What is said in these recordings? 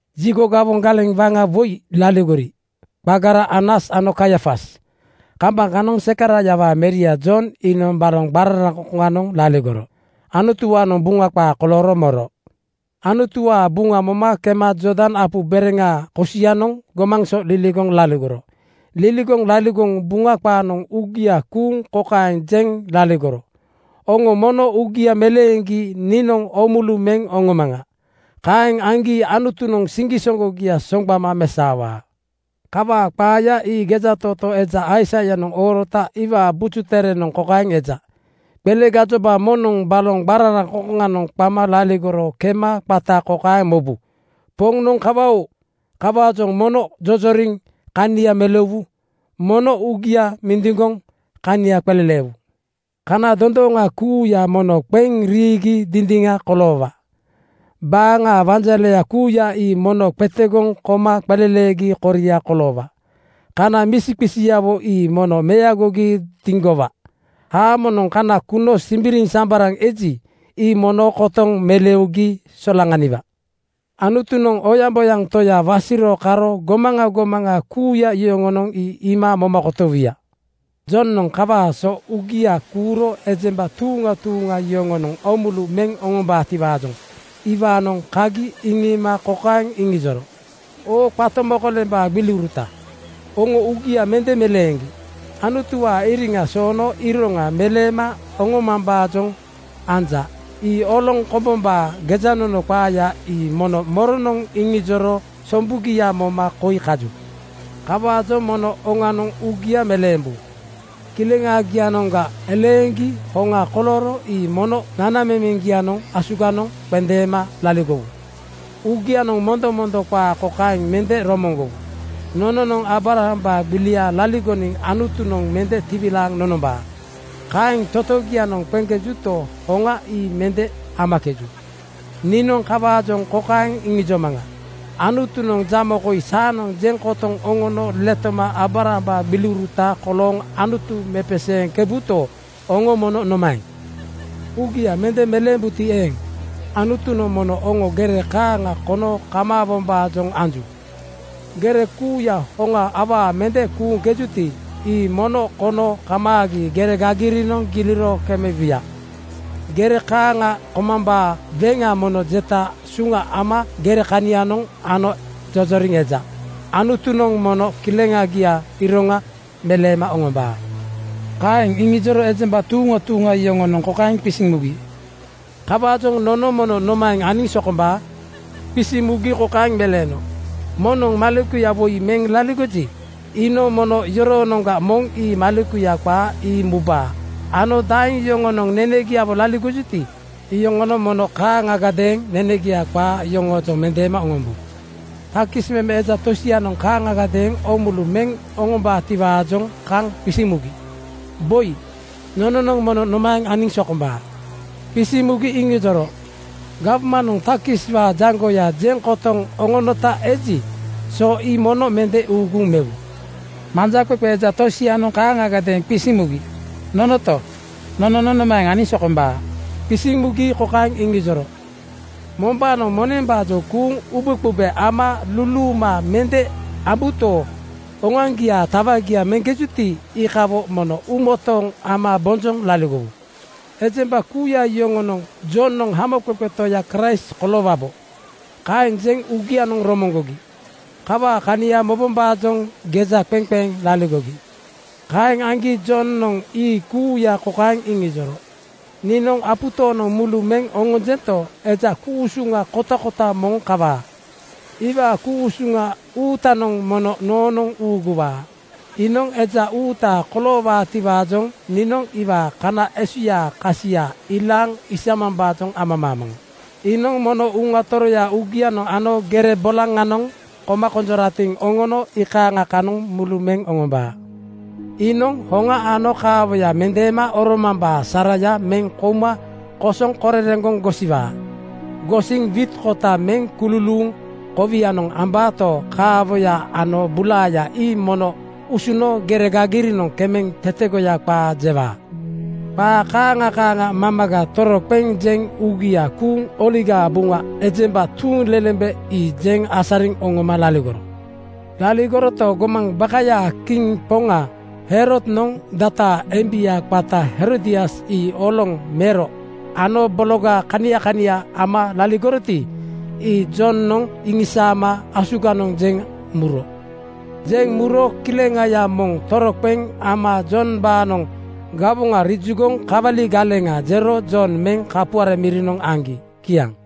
Jigo gawoŋ galeŋ waŋa woi laligori, qagara Anas ano Kaiafas. Kambaŋ kanoŋ Zekaraiawaa meria Jon iinoŋ baloŋ qararaŋkoŋ-koŋanoŋ laligoro Anutuwaanoŋ Buŋa qaa kolooro moro. Anutuwaa Buŋa moma kema Jordan apu bereŋaa kosianoŋ gomaŋ so liligoŋ laligoro. Liligoŋ laligoŋ Buŋa qaanoŋ uugia kuuŋ kokaeŋ jeŋ laligoro, “Oŋo mono uugia meleeŋgi niinoŋ oomulu meŋ oŋomaŋa. Kaeŋ aŋgi Anutunoŋ siŋgisoŋgogia soŋgbama mesaowaa.” Kawaa qaaya ii gejatootoo eja Aisaianoŋ oorota iwaa Buju Terenoŋ kokaeŋ eja, “Qele gajoba moŋnoŋ baloŋ qararaŋkoŋkoŋanoŋ qama laligoro kema qata kokaeŋ mobu, ‘Poŋnoŋ kawa-oo! Kawaajoŋ mono jojoriŋ kania meleuwu. Mono uugia mindiŋgoŋ kania qeleleewu. Kana dondooŋa kuuya mono qeŋ riigi dindiŋa koloowa. Baaŋa wanjaleya kuuya ii mono qetegoŋ koma qeleleegi koria koloowa. Kana misiqisiawo ii mono meagogi diŋgowa. Haamonoŋ kana kuno simbiriŋsambaraŋ eji, ii mono kotoŋ meleugi solaŋaniwa. Anutunoŋ oyaŋboyaŋ Toya wasiro karo gomaŋa gomaŋa kuuya yoŋonoŋ ii iima moma kotowuya.” Jonoŋ kawaa so uugia kuuro ejemba tuuŋa tuuŋa yoŋonoŋ oomulu meŋ oŋombaatiwaajoŋ iwaanoŋ kagi iŋiima kokaeŋ iŋijoro, “Oo qato mokolembaa gbiliuruta, oŋo uugia mende meleeŋgi Anutuwaa iriŋa soono iroŋa meleema oŋomambaajoŋ anja. Ii oloŋ kombombaa gejanono qaaya ii mono moronoŋ iŋijoro sombugia moma koi kaju? “Kawaajoŋ mono oŋanoŋ uugia meleembu. Kileŋagianoŋga eleeŋgi hoŋa kolooro ii mono nanamemeŋgianoŋ asuganoŋ qendeema laligowu. Uugianoŋ mondomondo qaa kokaeŋ mende romoŋgowu, ‘Nononoŋ Aabrambaa gbiliga laligoniŋ Anutunoŋ mende tiwilaaŋ nonombaa.’ Kaeŋ totogianoŋ qeŋkejuto, hoŋa ii mende amakeju. Niinoŋ kawaajoŋ kokaeŋ iŋijomaŋa: Anutunoŋ jamo koi saanoŋ jeŋ kotoŋ oŋono letoma Aabrambaa gbiliuruta kolooŋ Anutu mepeseeŋkebuto, oŋo mono nomaeŋ? “Uugia mende meleembuti eeŋ, Anutunoŋ mono oŋo gere kaaŋa kono kamaawombaajoŋ anju. Gere kuuya hoŋa awaa mende kuuŋkejuti, ii mono kono kamaagi gere gagirinoŋ giliro kemebuya. Gere kaaŋa komambaa weŋa mono jeta suŋa ama gere kanianoŋ ano jojoriŋ eja. Anutunoŋ mono kileŋagiaa iroŋa meleema oŋombaa.” Kaeŋ iŋijoro ejemba tuuŋa tuuŋa yoŋonoŋ kokaeŋ qisiŋ mugi, “Kawaajoŋ nono mono nomaeŋ aniŋ sokombaa?” Qisiŋ mugi kokaeŋ meleeno, “Moŋnoŋ maleku woi meŋ laligoji, iinoŋ mono yoroonoŋga moŋ ii malekuya qaa ii mubaa ano daeŋ yoŋonoŋ nenegiawo laligojuti, iyoŋonoŋ mono kaaŋagadeeŋ nenegia qaa yoŋoojoŋ mendeema oŋombu.” Takis meme eja tosianoŋ kaaŋagadeeŋ oomulu meŋ oŋombaatiwaajoŋ kaŋ qisiŋ mugi, “Boi, nononoŋ mono nomaeŋ aniŋ sokombaa?” Qisiŋ mugi iŋijoro, “Gawmanoŋ takiswaa jaŋgoya jeŋ kotoŋ oŋonota eji, so ii mono mende uuguŋ mewu.” Manjaqeqe eja tosianoŋ kaaŋagadeeŋ qisiŋ mugi, “Nonoto? Nononoŋ nomaeŋ aniŋ sokombaa?” Qisiŋ mugi kokaeŋ iŋijoro, “Mombaanoŋ monembaajoŋ kuuŋ ubeqube ama luluuma mende ambuto, oŋoaŋgiaa tawagia meŋkejuti, iikawo mono uumotooŋ ama bonjoŋ laligowu.” Ejemba kuuya yoŋonoŋ “Jonoŋ Hamoqeqe Toya Kraist koloowabo,” kaeŋ jeŋ uugianoŋ romoŋgogi. Kawaa kania mobombaajoŋ geja qeŋ qeŋ laligogi. Kaeŋ aŋgi Jonoŋ ii kuuya kokaeŋ iŋijoro, “Niinoŋ apu tooŋnoŋ mulu meŋ oŋonjento, eja ku-usuŋa kotakota moŋ kawaa. Iwaa ku-usuŋa uutanoŋ mono noonoŋ uuguwaa. Iinoŋ eja uuta koloowaatiwaajoŋ niinoŋ iwaa kana esuyaa kasia ilaaŋ isamambaajoŋ amamaamaŋa. Iinoŋ mono Uŋa Toroya uugianoŋ ano gere bolaŋanoŋ koma konjoratiŋ oŋono iikaaŋa kanoŋ mulu meŋ oŋombaa. Iinoŋ hoŋa ano kaawoya mendeema oromambaa saraya meŋ kouma kosoŋ korereŋgoŋ gosiwaa. Gosiŋ wiit kota meŋ kululuuŋ kowianoŋ ambaato, kaawoya ano bulaaya ii mono usuno gere gagirinoŋ kemeŋ tetegoya qaa jewaa.” Qaa kaaŋa kaaŋa mamaga toroqeŋ jeŋ uugia kuuŋ Oligaa Buŋa ejemba tuuŋlelembe ii jeŋ asariŋ oŋoma laligoro. Laligoroto, gomaŋ bakayaa kiŋ poŋa Herodnoŋ dataa embia qata Herodias ii oloŋ mero ano bologa kania kania ama laligoroti, ii Jonoŋ iŋisaama asuganoŋ jeŋ muro. Jeŋ muro kileŋaya moŋ toroqeŋ ama Jombaanoŋ gawoŋa riijugoŋ kawali galeŋa jero Jon meŋ kapuare mirinoŋ aŋgi. Kiaŋ.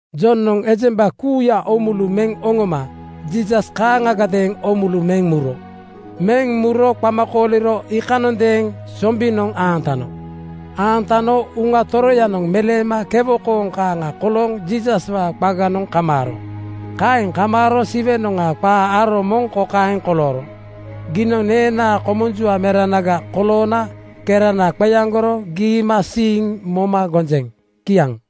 Jonoŋ ejemba kuuya oomulu meŋ oŋoma Jiisas kaaŋagadeeŋ oomulu meŋ muro. Meŋ muro qama kooliro iikanondeeŋ sombinoŋ aantano. Aantano Uŋa Toroyanoŋ meleema kewo kooŋ kaaŋa kolooŋ Jiisaswaa qaganoŋ kamaaro. Kaeŋ kamaaro Siwenoŋga qa aro moŋ kokaeŋ kolooro, “Giinoŋ neenaa komunjua meranaga koloona kerana qeaŋgoro giimasiiŋ moma gonjeŋ.” Kiaŋ.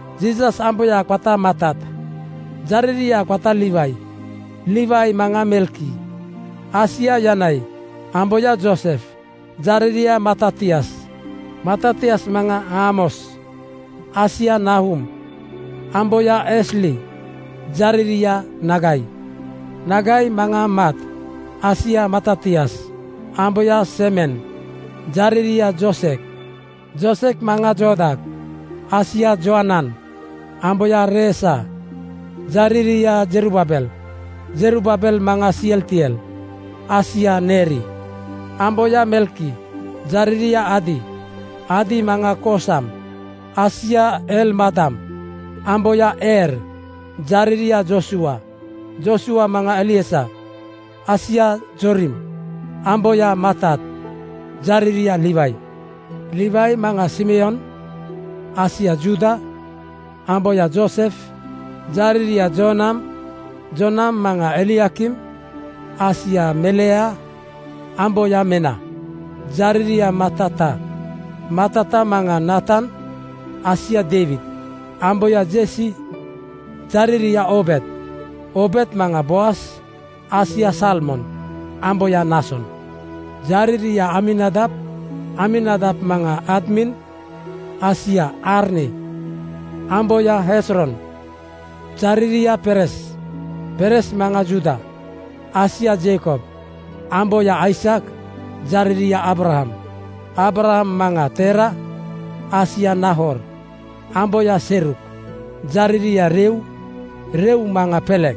Jiisas amboya qata Matat, jariria qata Liwai. Liwai maŋa Melki, asia Janai, amboya Joosef, jariria Matatias. Matatias maŋa Aamos, asia Naahum, amboya Esli, jariria Nagai. Nagai maŋa Mat, asia Matatias, amboya Semen, jariria Joosek. Joosek maŋa Jooda, asia Joanan, amboya Reesa, jariria Zerubaabel. Zerubaabel maŋa Sealtiel, asia Neeri. Amboya Melki, jariria Adi. Adi maŋa Koosam, asia Elmadam, amboya Eer, jariria Joosua. Joosua maŋa Eliezer, asia Joorim, amboya Matat, jariria Liwai. Liwai maŋa Simeon, asia Juuda, amboya Joosef, jariria Joonam. Joonam maŋa Eliakim, asia Melea, amboya Mena, jariria Matata. Matata maŋa Naatan, asia Deiwid, amboya Jesi, jariria Oobed. Oobed maŋa Boaz, asia Salmon, amboya Naason. Jariria Aminadab. Aminadab maŋa Admin, asia Arni, amboya Hezron, jariria Perez. Perez maŋa Juuda, asia Jeikob, amboya Aisak, jariria Aabraham. Aabraham maŋa Teera, asia Naahor, amboya Seruk, jariria Reu. Reu maŋa Pelek,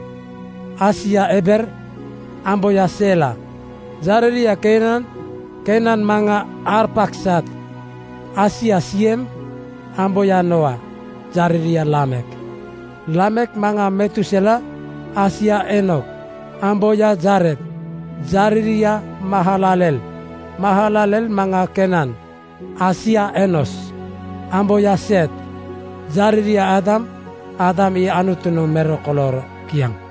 asia Eber, amboya Seela, jariria Kainan. Kainan maŋa Arpaksad, asia Siem, amboya Nooa, jariria Laamek. Laamek maŋa Metusela, asia Eenok, amboya Jared, jariria Mahalalel. Mahalalel maŋa Keenan asia Enos, amboya Seet, jariria Aadam. Aadam ii Anutunoŋ mero kolooro. Kiaŋ.